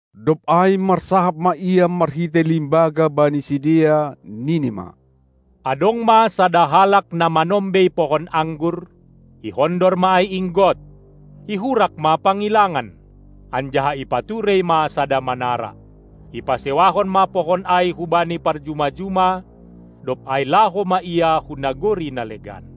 Dob ai marsahap ma Ia marhitei limbaga bani sidea, nini ma: Adong ma sada halak na manombei pohon anggur, ihondor ma ai inggot, ihurak ma pangilangan, anjaha ipaturei ma sada manara. Ipasewahon ma pohon ai hubani parjuma-juma, dob ai laho ma ia hu nagori na legan.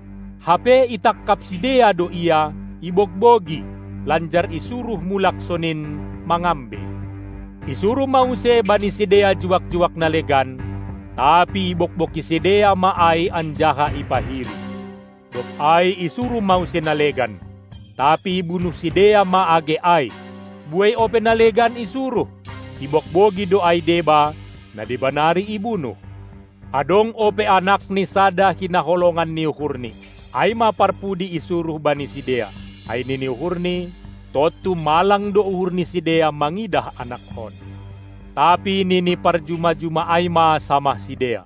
Hape itangkap sidea do ia, ibogbogi, lanjar isuruh mulak sonin, mangambei. Isuruh ma use bani sidea juak-juak na legan, tapi ibogbogi sidea ma ai anjaha ipahiri. Dob ai isuruh ma use na legan, tapi ibunuh sidea ma age ai. Buei ope na legan isuruh, ibogbogi do ai deba, na deba nari ibunuh. Adong ope anakni sada hinaholongan ni uhurni. Ai ma parpudi isuruh bani sidea, ai nini uhurni: Tontu malang do uhur ni sidea mangidah anakhon. Tapi nini parjuma-juma ai ma samah sidea: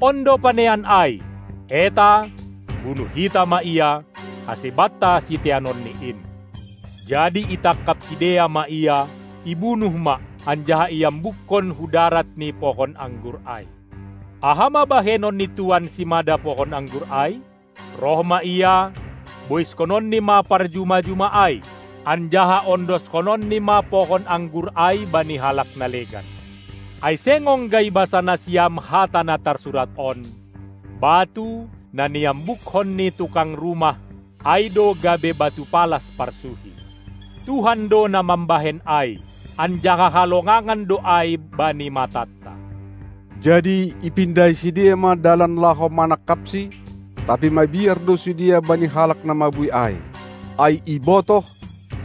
On do panean ai! Eta, bunuh hita ma ia, ase banta siteanonni in! Jadi itangkap sidea ma ia, ibunuh ma, anjaha iambukkon hu darat ni pohon anggur ai. Aha ma bahenon ni tuan simada pohon anggur ai? Roh ma ia, boiskononni ma parjuma-juma ai, anjaha ondoskononni ma pohon anggur ai bani halak na legan. Ai seng ongga ibasa nasiam hata na tarsurat on: Batu, na niambukkon ni tukang rumah, ai do gabe batu palas parsuhi. Tuhan do na mambahen ai, anjaha halongangan do ai bani matanta. Jadi ipindahi sidea ma dalan laho manangkapsi, tapi mabiar do sidea bani halak na mabuei ai. Ai ibotoh,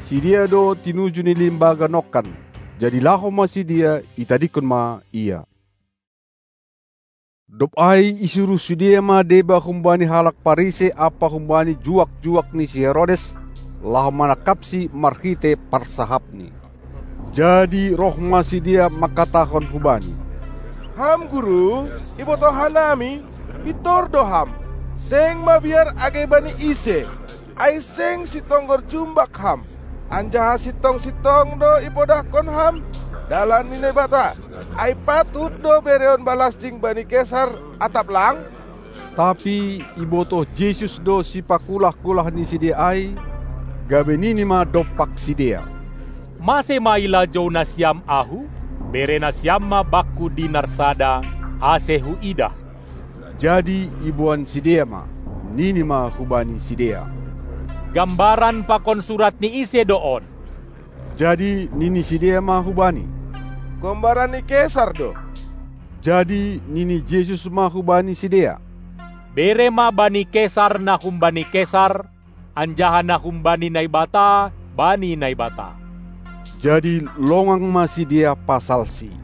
sidea do tinuju ni limbaga nongkan. Jadi laho ma sidea, itadingkon ma Ia. Dob ai isuruh sidea ma deba humbani halak Parisei ampa humbani juak-juak ni si Herodes, laho manangkapSi marhitei parsahapNi. Jadi roh ma sidea mangkatahon hu Bani: Ham Guru, ibotoh hanami, pintor do Ham, seng mabiar age bani ise, ai seng sitonggor jumbak Ham, anjaha sintong-sintong do ipodahkon Ham dalan ni Naibata. Ai patut do bereon balasting bani Kesar atap lang? Tapi ibotoh Jesus do sipakulah-kulah ni sidea ai, gabe nini ma dompak sidea: Mase ma ilajou nasiam Ahu? Bere nasiam ma Bakku dinar sada, ase huidah! Jadi iboan sidea ma. Nini ma hubani sidea: Gambaran pakon surat ni ise do on? Jadi nini sidea ma hu Bani: Gombaran ni kesar do! Jadi nini Jesus ma hubani sidea: Bere ma bani kesar na humbani kesar, anjaha na humbani Naibata bani Naibata. Jadi longang ma sidea pasalSi.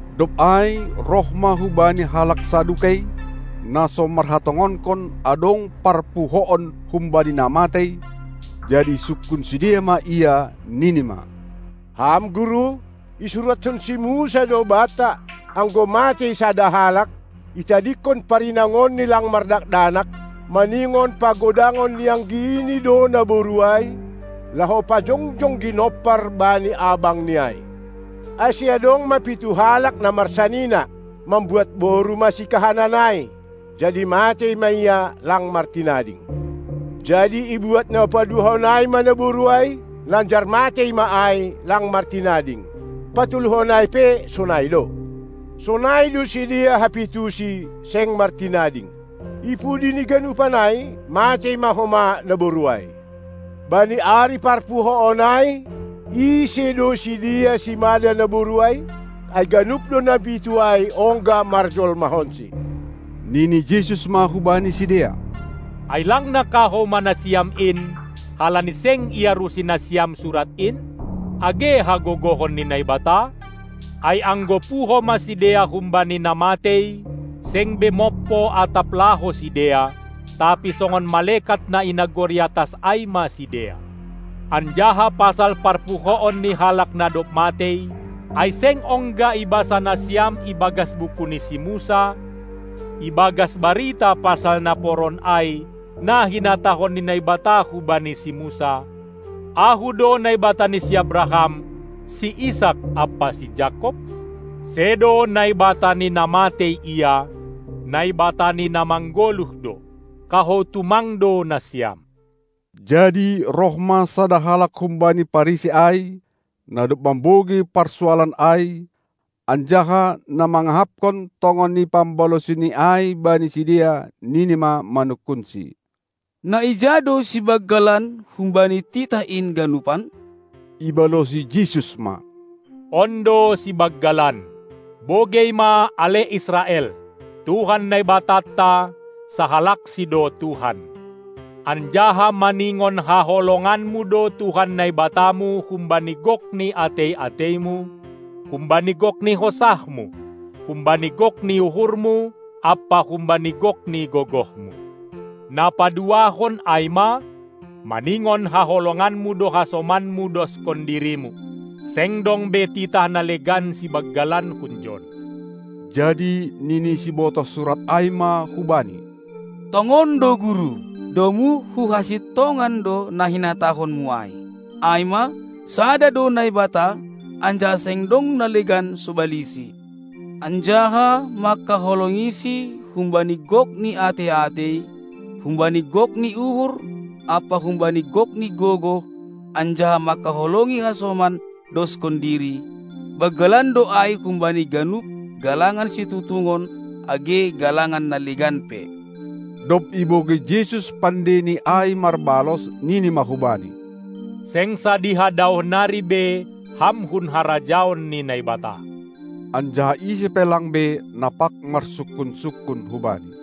Dob ai roh ma hu Bani halak Sadukei, na so marhatongonkon, adong parpuhoon humbani na matei, jadi isungkun sidea ma Ia, nini ma: Ham Guru! Isuratkon si Musa do banta: Anggo matei sada halak, itadingkon parinangonni lang mardakdanak, maningon pagodangon ni anggini do naboru ai, laho pajongjong ginompar bani abangni ai. Ase adong ma pitu halak na marsanina: Mambuat boru ma sikahanan ai, jadi matei ma ia, lang martinading. Jadi ibuat na paduahon ai ma naboru ai, lanjar matei ma ai, lang martinading. Patoluhon ai pe sonai do. Sonai do sidea hapitusi, seng martinading. Ipudi ni ganupan ai, matei ma homa naboru ai. Bani ari parpuhoon ai, ise do sidea simada naboru ai? Ai ganup do na pitu ai ongga marjolmahonsi. Nini Jesus ma hubani sidea: Ai lang na kahou ma nasiam in, halani seng iarusi nasiam Surat in, age hagogohon ni Naibata? Ai anggo puho ma sidea humbani na matei, seng be mompo atap laho sidea, tapi songon malekat na i nagori atas ai ma sidea. Anjaha pasal parpuhoon ni halak na dob matei, ai seng ongga ibasa nasiam ibagas buku ni si Musa, ibagas barita pasal naporon ai, na hinatahon ni Naibata hubani si Musa: Ahu do Naibata ni si Abraham, si Isak ampa si Jakob? Sedo Naibata ni na matei Ia, Naibata ni na manggoluh do. Kahou tumang do nasiam. Jadi roh ma sada halak humbani Parisei ai, na dob mambogei parsualan ai, anjaha na mangahapkon tongon ni pambalosiNi ai bani sidea, nini ma manungkunSi: Na ija do sibanggalan humbani titah in ganupan? Ibalosi Jesus ma: On do sibanggalan: Bogei ma, ale Israel, Tuhan, Naibatanta, sahalakSi do Tuhan. Anjaha maningon haholonganmu do Tuhan Naibatamu humbani gok ni atei-ateimu, humbani gok ni hosahmu, humbani gok ni uhurmu ampa humbani gok ni gogohmu! Na paduahon, ai ma: Maningon haholonganmu do hasomanmu doskon dirimu. Seng dong be titah na legan sibanggalan hunjon. Jadi nini sibotoh surat ai ma hu Bani: Tongon do Guru, domu hu hasintongan do na hinatahonMu ai, ai ma, sada do Naibata, anjaha seng dong na legan sobaliSi. Anjaha mangkaholongiSi humbani gok ni atei-atei, humbani gok ni uhur ampa humbani gok ni gogoh anjaha mangkaholongi hasoman doskon diri, banggalan do ai humbani ganup galangan situtungon age galangan na legan pe. Dob ibogei Jesus pandeini ai marbalos, nini ma hubani: Seng sadiha daoh nari be ham hun harajaon ni Naibata! Anjaha ise pe lang be, na pag marsungkun-sungkun hu Bani.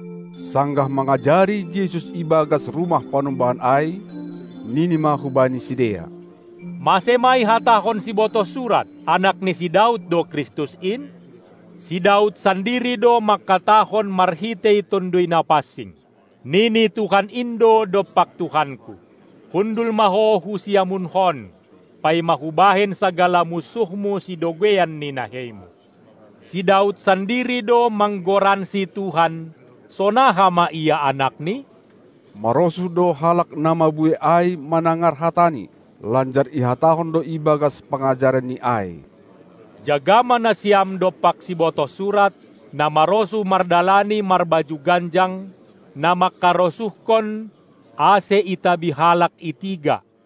Sanggah mangajari Jesus i bagas rumah panumbahan ai, nini ma hubani sidea: Mase ma ihatahon sibotoh surat, Anak ni si Daud do Kristus in? Si Daud sandiri do mangkatahon marhitei Tonduy Napansing: Nini Tuhan in do dompak Tuhanku: Hundul ma ho hu siamunHon, paima Hubahen sagala munsuhMu sidogeian ni naheiMu. Si Daud sandiri do manggoransi Tuhan, sonaha ma ia Anakni? Marosuh do halak na mabuei ai manangar hataNi. Lanjar ihatahon do ibagas pangajaranNi ai: Jaga ma nasiam dompak sibotoh surat, na marosuh mardalani marbaju ganjang, na mangkarosuhkon, ase itabi halak i tiga,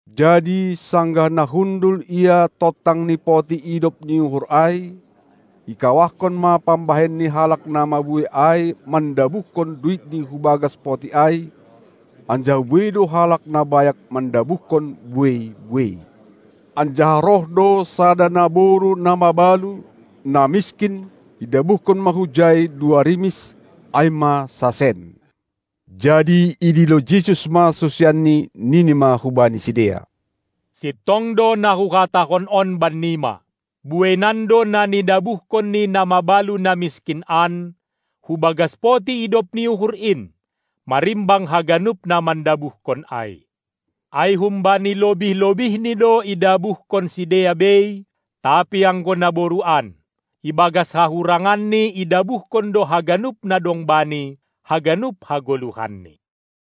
Jadi sanggah na hundul Ia tontang ni poti idop ni uhur ai, ikawahkon ma pambahen ni halak na mabuei ai mandabuhkon duitni hu bagas poti ai, anjaha buei do halak na bayak mandabuhkon buei-buei. Anjaha roh do sada naboru na mabalu, na miskin, idabuhkon ma hujai dua rimis, ai ma sasen. Jadi idilo Jesus ma susianNi, nini ma hubani sidea: Sintong do na Huhatahon on bannima: Bueinan do na nidabuhkon ni na mabalu na miskin an, hu bagas poti idop ni uhur in, marimbang haganup na mandabuhkon ai. Ai humbani lobih-lobihni do idabuhkon sidea bei; tapi anggo naboru an, ibagas hahuranganni idabuhkon do haganup na dong bani, haganup hagoluhanni.